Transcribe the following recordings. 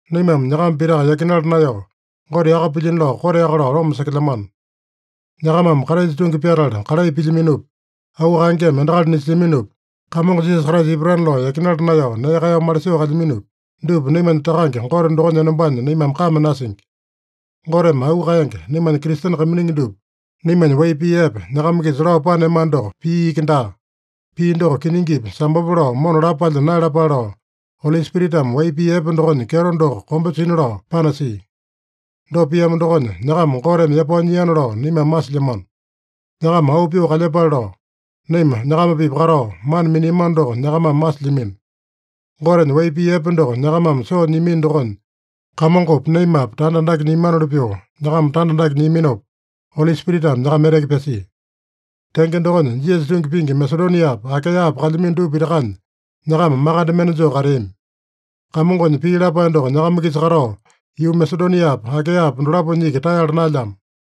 Naimame nyakama pitaka yakinala naeyao, Gote yaka pilyino lao koteaka lao loma sekelyamano. Nyakamame Kraisa tungi pyatala kalai pilyaminopi, auu kaengeme endakali nisilyaminopi, Kamongo Jisasa Kraisa ipatana lao yakinala naeyao nee kaeyao malisoo kalyaminopi, dupa naimanya Takange Gote dokonya enombanya naimame kame nasingi. Goteme auu kaenge, naimanya Kristene kaiminingi dupa, naimanya wai pii epe, nyakama-kisa lao paneamano doko, pii iki daa. Pii doko kiningipi, sambope lao mona lapo palya naeyalapale lao, Oli Spiritame wai pii epe dokonya kyeto doko kombe sina lao panasia. Dopa piamo dokonya, nyakama Goteme yapao nyiana lao naimame masilyamano. Nyakama auu pyoo kalyepale lao, naima nyakama-pipa katao, mana miniamano doko nyakamame masilyamino. Gotenya wai pii epe doko nyakamame soo nyiamino dokonya Kamongopi, naimapi tanda andake nyiamanoli pyoo nyakama tanda andake nyiaminopa, Oli Spiritame nyakama eteke pyasia. Tenge dokonya, Jisasa tungi pingi Masedoniapa, Akaeyapa kalyamino dupa pitakanya, nyakama makande mende joo kateami. Kamongonya pii lapae doko nyakama-kisa katao, yuu Masedoniapa, Akaeyapa dolaponya iki taeyala naelyamo.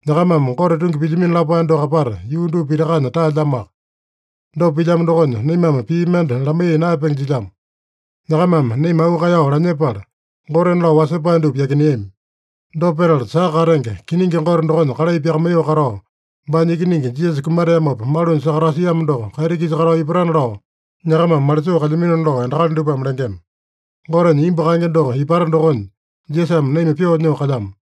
Nyakamame Gote tungi pilyamino lapae doko apata yuu dupa pitakanya taelyamoaka. Dopa pilyamo dokonya, naimame pii mende lamaiya naeyapenge jilyamo. Nyakamame naima auu kaeyao lanyepala, gotena lao wasepae dupa yakineami. Dopa petala, saka katenge kiningi Gote dokonya kalai pyakamaiyoo katao, baanya Ikiningi Jisasa kumateamopa malunya sakatasiamo doko kaiti-kisa katao ipatana lao nyakamame malisoo kalyaminona lao endakali dupame lengema. Gotenya imbu kaenge doko ipata dokonya, Jisasame naima pyoo nyoo kalyamo.